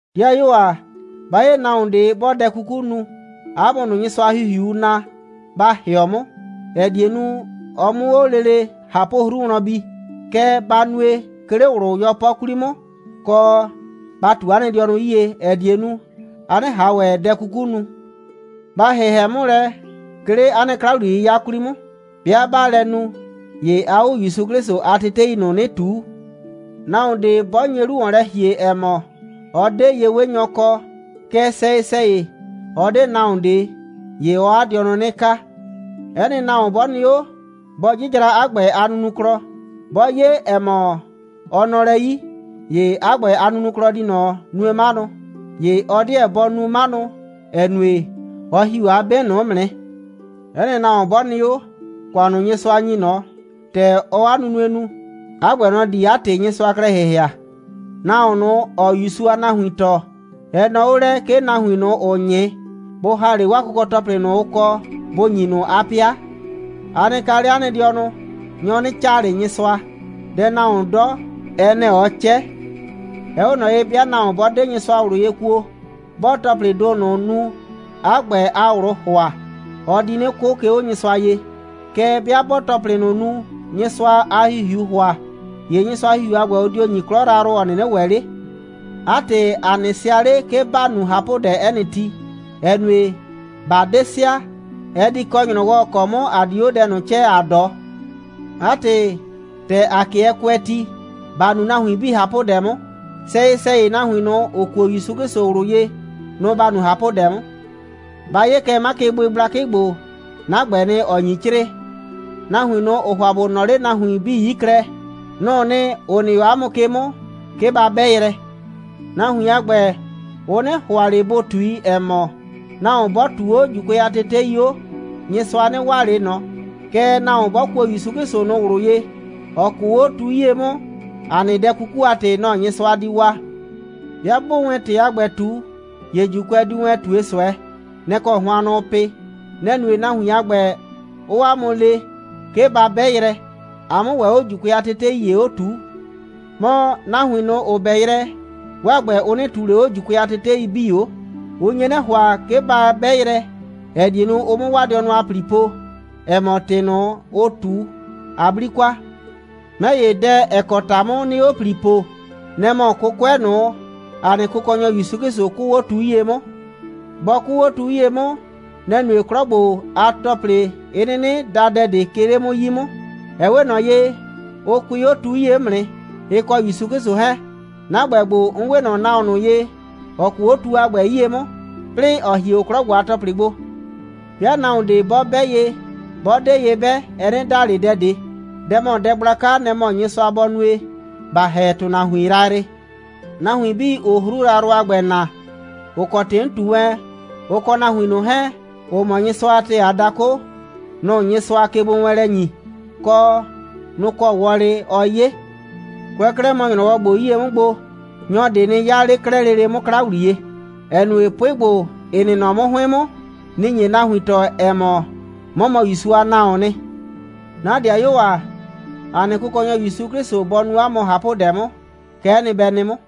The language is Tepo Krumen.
'Dɩayuo ‑a, 'ba 'ye nahuon ꞊de, 'bɔɔ dɛ 'kuku nu, 'a mʋ ꞊nʋ, Nyɩsʋa a ‑Hihiuu naa, ba ‑hɩɔ 'mʋ, ‑ɛ die nu, ɔ 'mʋ 'o lele ꞊hapʋ'hru wlɔn bi. Kɛɛ, ba nue, 'ke 'le ꞊wlʋ 'yɔpɔ 'kwli 'mʋ, kɔ, ba ꞊tu 'a nɩ dɩɔnʋ 'yie, ‑ɛ die nu, a 'nɩ ꞊han ‑wɛ dɛ 'kuku nu. Ba ‑hɩhɛ 'mʋ lɛ, 'ke 'le 'a nɩ 'kla‑wliye'yɩya 'kwli 'mʋ. 'Bɩa 'baa lɛ nu, ‑ye aa 'o ‑Yusu 'Klɩsʋ a tetei ꞊nʋ 'nɩ ꞊tuu. Nahuon ꞊de 'bɔ nye 'lu ‑wɔn lɛ ‑hie, ‑ɛ mɔ, ɔ 'de ye'wenyɔ kɔ, kɛɛ, sɛyɩ‑sɛyɩ, ɔ 'de nahuon ꞊de, ‑ye ɔɔ 'a dɩɔnʋ 'nɩ kaa. 'Ɛ nɩ nahuon 'bɔ nɩ 'o, bɔ 'jɩjra 'a ‑gbɛ a nunuklɔ. 'Bɔ 'ye, ‑ɛ mɔ, ɔ nɔ lɛ 'yi, ‑ye 'a ‑gbɛ a nunuklɔ di ꞊nɔ nue 'manʋ. ‑Ye ɔ 'deɛ bɔ nu 'manʋ, ‑ɛ nue, ɔ ‑hi 'o 'a 'be ꞊nʋ 'mʋ nɩ. 'Ɛ nɩ nahuon 'bɔ nɩ 'o, ‑kʋan ꞊nʋ, Nyɩsʋa ‑nyi ꞊nɔ, ‑tɛ ɔɔ 'a nunue nu, 'a ‑gbɛ, nɔ‑ di 'a ‑tɩ Nyɩsʋa klɛ ‑hɩhɩa. Nahuon ꞊nʋ, ‑ɔɔ ‑Yusu a nahuin tɔɔ, ɛ nɔɔ 'o lɛ, 'ke nahuin ꞊nʋ, ‑ʋʋ 'nyɩ, bʋ ‑ha 'le 'waa kʋkɔ‑tɔplɩ ꞊nʋ, ʋ kɔ, bʋ ‑nyi ꞊nʋ 'a 'pɩa. A nɩ kaa 'le 'a nɩ dɩɔnʋ. Nyɔ 'nɩ 'caa ꞊le Nyɩsʋa. Dɛ nahuoon 'dɔ, ɛ nɛ‑ ɔɔ 'cɛ. Ɛ 'we ꞊nɔ ye, 'bɩa nahuon 'bɔ 'de Nyɩsʋa ꞊wlʋ ye kuo, 'bɔɔ ‑tɔplɩɩ ‑do ꞊nʋ nu, 'a ‑gbɛ a ꞊wlʋʋ ‑hʋa, ɔ di 'nɩ 'kʋ, 'ke 'o Nyɩsʋa ye. Kɛɛ, 'bɩa 'bɔɔ ‑tɔplɩ ꞊nʋ nu, Nyɩsʋa a ‑Hihiuu ‑hʋa, ‑ye Nyɩsʋa a ‑Hihiu a ‑gbɛ, ʋ dio ‑nyi 'klɔ yrayrʋ, ‑ɔ 'nɩnɩ ‑wɛ 'le. 'A ‑tɩ, ‑a 'nɩ sɩa 'le, 'ke ‑ba nu ꞊hapʋdɛ 'ɛ nɩ ti, ‑ɛ nue, ꞊ba 'de sɩa, ɛ di kɔ ‑nyrɔwɔ, ‑ɔ kɔ 'mʋ ‑a di 'o dɛ ꞊nʋ 'cɛɛ, ‑a 'dɔ. 'A ‑tɩ, ‑tɛ ‑a 'kɩɛ kʋɛ ti, ‑ba nu nahuin 'bii ꞊hapʋdɛ 'mʋ, sɛyɩ‑sɛyɩ, nahuin ꞊nʋ, ‑ʋ kuo ‑Yusu 'Klɩsʋ ꞊wlʋ ye, nʋ‑ ‑ba nu ꞊hapʋdɛ 'mʋ. Ba 'ye kɛ 'makɩbʋɩ gblakɩ ‑gbo. 'Na ‑gbɛɛ nɩ, ‑ɔ nyi 'crɩɩ. Nahuin ꞊nʋ, ‑ʋʋ ‑hʋa ‑bʋ nɔɔ 'le nahuin 'bii 'yi klɛ, nʋ‑ʋ nɩ, ‑ʋ nɩ 'o 'a mʋ ke 'mʋ, 'ke ba 'bɛ yrɛ. Nahuin a ‑gbɛ, ʋ 'nɩ ‑hʋa ꞊le bʋ ꞊tui, ‑ɛ mɔ, nahuon 'bɔ ꞊tuu 'o ‑Juukʋɛ a tetei 'o, Nyɩsʋa 'nɩ waa ꞊le ꞊nɔ, kɛɛ, nahuon 'bɔ kuo ‑Yusu 'Klɩsʋ ꞊nʋ ꞊wlʋ ye, ‑ɔ 'kʋʋ 'o tu 'yie 'mʋ, ‑a nɩ dɛ 'kuku a ‑tɩ, nɔ‑ Nyɩsʋa di waa. 'Bɩa 'bʋʋ wɛn ‑tɩ a ‑gbɛ ꞊tu, ‑ye ‑Juukʋɛ diu wɛn ꞊tue ꞊sʋɛ. Nɛ‑ kɔ hʋannʋ ʋʋ pɩ. Nɛ‑ nue, nahuin a ‑gbɛ, 'ʋʋ 'a mʋ le, 'ke ba 'bɛ yrɛ, a 'mʋ ‑wɛ 'o ‑Juukʋɛ a tetei ‑ye 'o ꞊tuu. Mɔ, nahuin ꞊nʋ, ‑ʋ 'bɛ yrɛ, 'waa ‑gbɛ, ʋ 'nɩ ꞊tuu ꞊le 'o ‑Juukʋɛ a tetei 'bii 'o. Ʋ nye 'nɩ ‑hʋa, 'ke ba 'bɛ yrɛ, ‑ɛ die nu, ʋ 'mʋ 'waa dɩɔnʋ a ‑pli po, ‑ɛ mɔ, ‑tɩ ꞊nʋ, ʋʋ ꞊tu, a 'bli kwa. 'Mɛ ‑ye, dɛ, ‑ɛ kɔ ‑ta 'mʋ 'nɩɩ 'o ‑pli poo, nɛ‑ mɔ 'kʋkʋɛ ꞊nʋ, ‑a nɩ Kʋkɔnyɔ ‑Yusu 'Klɩsʋ 'kʋʋ 'o tu 'yie 'mʋ. Bɔ 'kʋʋ 'o tu 'yie 'mʋ, nɛ‑ nue, 'klɔ ‑gbo a ‑tɔplɩ 'ɩ 'nɩnɩ da dɛ ꞊de, 'ke 'le 'mʋ 'yi 'mʋ. Ɛ 'we ꞊nɔ ye, ʋ kʋɩ 'o tu 'yie 'mʋ nɩ, ɩ kɔ ‑Yusu 'Klɩsʋ 'hɛɛn. 'Na ‑gbɛ ‑gbo, 'n 'we ꞊nɔ nahuon ꞊nʋ ye, ‑ɔ 'kʋʋ 'o tu ‑a gbɛ 'yie 'mʋ, 'plɩɩ, ‑ɔ hie 'o 'klɔ ‑gbo a ‑tɔplɩ gbo. 'Bɩa nahuon ꞊de 'bɔ 'bɛ ye, 'bɔ 'de ye 'bɛ, ɛ 'nɩ da ꞊le dɛ ꞊de. Dɛ ‑mɔ dɛ gblaka, nɛ‑ mɔ Nyɩsʋa bɔ nue, ‑ba ‑hɛ ‑tʋnahuin yrayrɩ. Nahuin 'bii, ‑ʋʋ 'hru yrayrʋ a ‑gbɛ na, ‑ʋ kɔ ‑tɩ 'n ꞊tu wɛn, ʋ kɔ nahuin ꞊nʋ 'hɛɛn, ‑ʋ mɔ Nyɩsʋa a ‑tɛɛ a dakʋ, nʋ‑ Nyɩsʋaa kegbowɛɛnlɛ ‑nyi, kɔ, nʋ‑ kɔ wɔlɩ ɔɔ 'ye. Kʋɛ 'klɛɛ mɔ ‑nyrɔwɔ ‑gbo 'yie 'mʋ gbo, nyɔ ꞊de nɩ 'yaa 'le 'klɛɛ lele 'mʋ 'kla ‑wliye, ‑ɛ nue, 'pʋɩ ‑gbo, ‑ɩ nɩ nɔ 'mʋ 'hʋɩn 'mʋ, nɩ‑ nye nahuin tɔɔ, ‑ɛ mɔ, 'mɔ mɔ ‑Yusu a nahuoon nɩ. 'Na 'dɩayuo ‑a, ‑a nɩ Kʋkɔnyɔ ‑Yusu 'Klɩsʋ bɔ nu 'a mʋ ꞊hapʋdɛ 'mʋ. Kɛ'ɛ nɩ, bɛ nɩ 'mʋ.